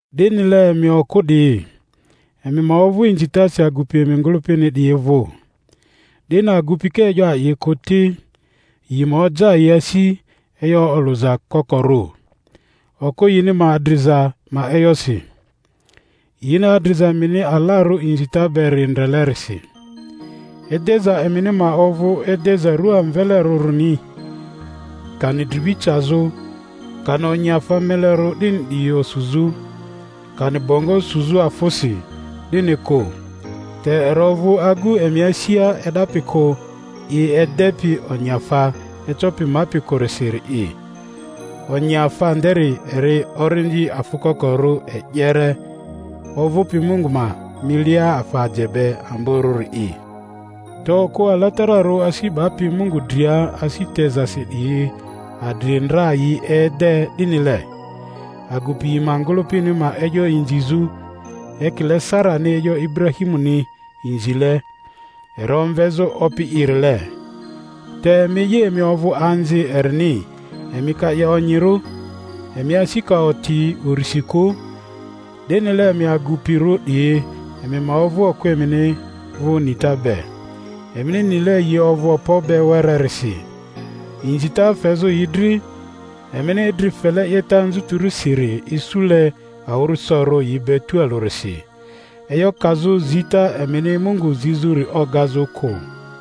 Dinile emi okᴜ 'diyi, emi ma ovᴜ inzitasi agupi emi ngᴜlᴜpini 'diyi vᴜ, 'dini agupi ka e'yo a'i kᴜ ti, yi ma oja yi asi, e'yo olᴜza kokorᴜ, okᴜ yini ma adriza ma e'yosi, yini adriza emini alarᴜ inzita beri ndrelerisi. Edeza emini ma ovᴜ edeza rᴜa amvelerᴜrini, kani dribi cazᴜ, kani onyiafa melerᴜ 'dini 'diyi osuzᴜ, kani bongo suzᴜ afᴜsi, 'dini kᴜ; te eri ovᴜ agu emi asia e'dapi kᴜ, i edepi onyiafa ecopi mapi kᴜrisiri'i, onyiafa nderi eri orindi afᴜ kokorᴜ e'yere, ovᴜpi Mungu ma milia afa aje be amborᴜri'i. Te okᴜ alatararᴜ asi 'bapi Mungu dria asi tezasi 'diyi adri ndra yi ede 'dinile, agupi yi ma ngᴜlᴜpini ma e'yo inzizᴜ, ekile Sarani e'yo Iburahimuni inzile, eri omvezᴜ opi'irile. Te emi'i, emi ovᴜ anzi erini emi ka 'ye onyirᴜ, emi asi ka oti urisi kᴜ. 'Dinile emi agupirᴜ 'diyi, emi ma ovᴜ okᴜ emini vᴜ nita be, emini nile yi ovᴜ okpo be wererisi, inzita fezᴜ yi dri, emini idri fele 'yeta anzutirisiri isule awᴜrᴜsorᴜ yi be tualᴜrisi; e'yo kazᴜ zita emini Mungu zizᴜri ogazᴜ kᴜ.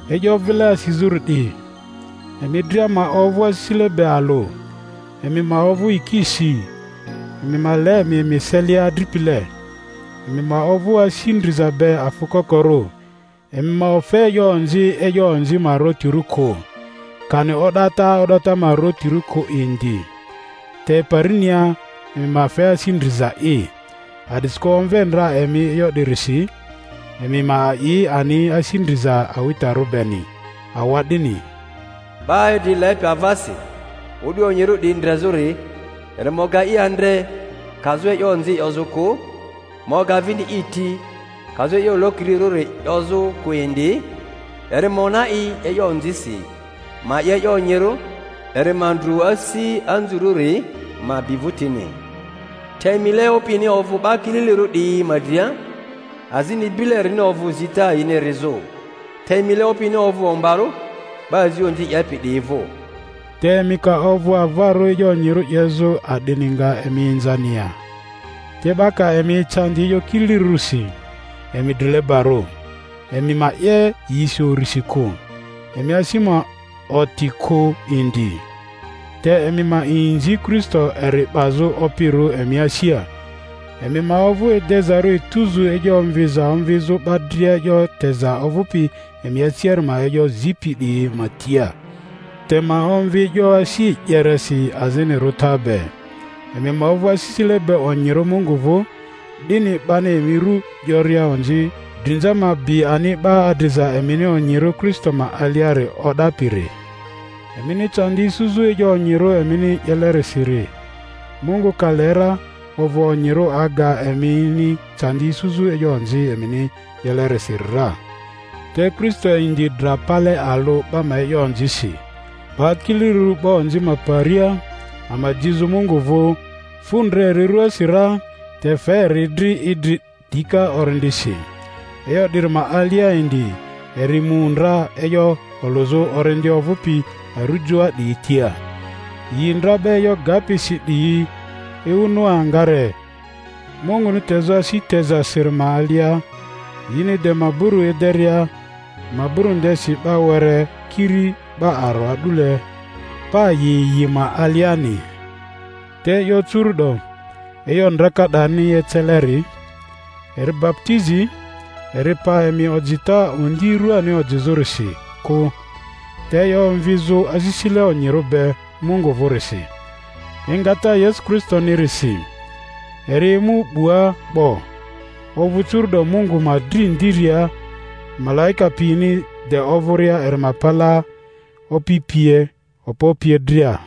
E'yo vile asizᴜri 'di, emi dria ma ovᴜ asisile be alᴜ, emi ma ovᴜ yikisi, emi ma le emi emi eselia adripile, emi ma ovᴜ asi ndriza be, afᴜ kokorᴜ. Emi ma ofe e'yo onzi e'yo onzi ma ariotirᴜ kᴜ, kani o'data o'data ma ariotirᴜ kᴜ indi; te parinia emi ma fe asi ndrizai, a'disikᴜ omve ndra emi e'yo 'dirisi, emi ma a'i ani asi ndriza awitarᴜ beni. Awa'dini, Ba idri lepi avasi o'du onyirᴜ 'diyi ndrezᴜri, eri ma oga i andre, kazᴜ e'yo onzi 'yozᴜ kᴜ, ma oga vini i ti, kazᴜ e'yo lokirirᴜ 'yozᴜ kᴜ indi; eri ma ona i e'yo onzisi, ma 'ye e'yo onyirᴜ; eri ma ndru asi anzurᴜri, ma bi vᴜtini. Te mile Opini ovᴜ 'ba kililirᴜ 'diyi ma dria, azini bile erini ovᴜ zita yini erizᴜ. Te mile Opini ovᴜ ombarᴜ 'ba azi onzi 'yepi 'diyi vᴜ. Te emi ka ovᴜ avarᴜ e'yo onyirᴜ 'yezᴜ, a'dini nga emi inzani ya? Te 'ba ka emi ecandi e'yo kililirᴜrisi, emi drilebarᴜ. Emi ma 'ye yisi urisi kᴜ, emi asi ma oti kᴜ indi, te emi ma inzi Kristo, eri 'bazᴜ Opirᴜ emi asia. Emi ma ovᴜ edezarᴜ etuzu e'yo omviza omvizᴜ 'ba dria e'yo teza ovᴜpi emi asiari ma e'yo zipi 'diyi ma tia, te ma omvi e'yo asi e'yeresi azini rᴜta be. Emi ma ovᴜ asisile be onyirᴜ Mungu vᴜ, 'dini 'bani emi ru 'yoria onzi, drinza ma bi ani 'ba adriza emini onyirᴜ Kristo ma aliari o'dapiri. Emini candi isuzᴜ e'yo onyirᴜ emini 'yelerisiri, Mungu ka le ra, ovᴜ onyirᴜ aga emini candi isuzᴜ e'yo onzi emini 'yelerisiri ra. Te Kristo indi dra pale alᴜ 'ba ma e'yo onzisi, 'ba kililirᴜri 'ba onzi ma paria, ama jizᴜ Mungu vᴜ; fu ndra eri ruasi ra, te fe eri dri idri dika orindisi; e'yo 'diri ma alia indi eri mu ndra e'yo olᴜzᴜ orindi ovᴜpi arujoa 'diyi tia, yi ndra 'ba e'yo gapi si 'diyi, ewu Noa ngare Munguni tezᴜ asi tezasiri ma alia, yini de maburu ederia; maburu ndesi 'ba were, kiri 'ba aro a'dule, pa yi yi ma aliani. Te e'yo curu'do, e'yo ndraka 'darini eceleri, eri baputizi; eri pa emi ojita ondi ruani ojizᴜrisi kᴜ, te e'yo omvizᴜ asisile onyirᴜ be Mungu vᴜrisi, engata Yesu Kristonirisi; eri mu 'bua 'bo, ovᴜ curu’do Mungu ma dri ndiria, malaika piyini de ovᴜria eri ma palaa, opi pie, okpo pie dria.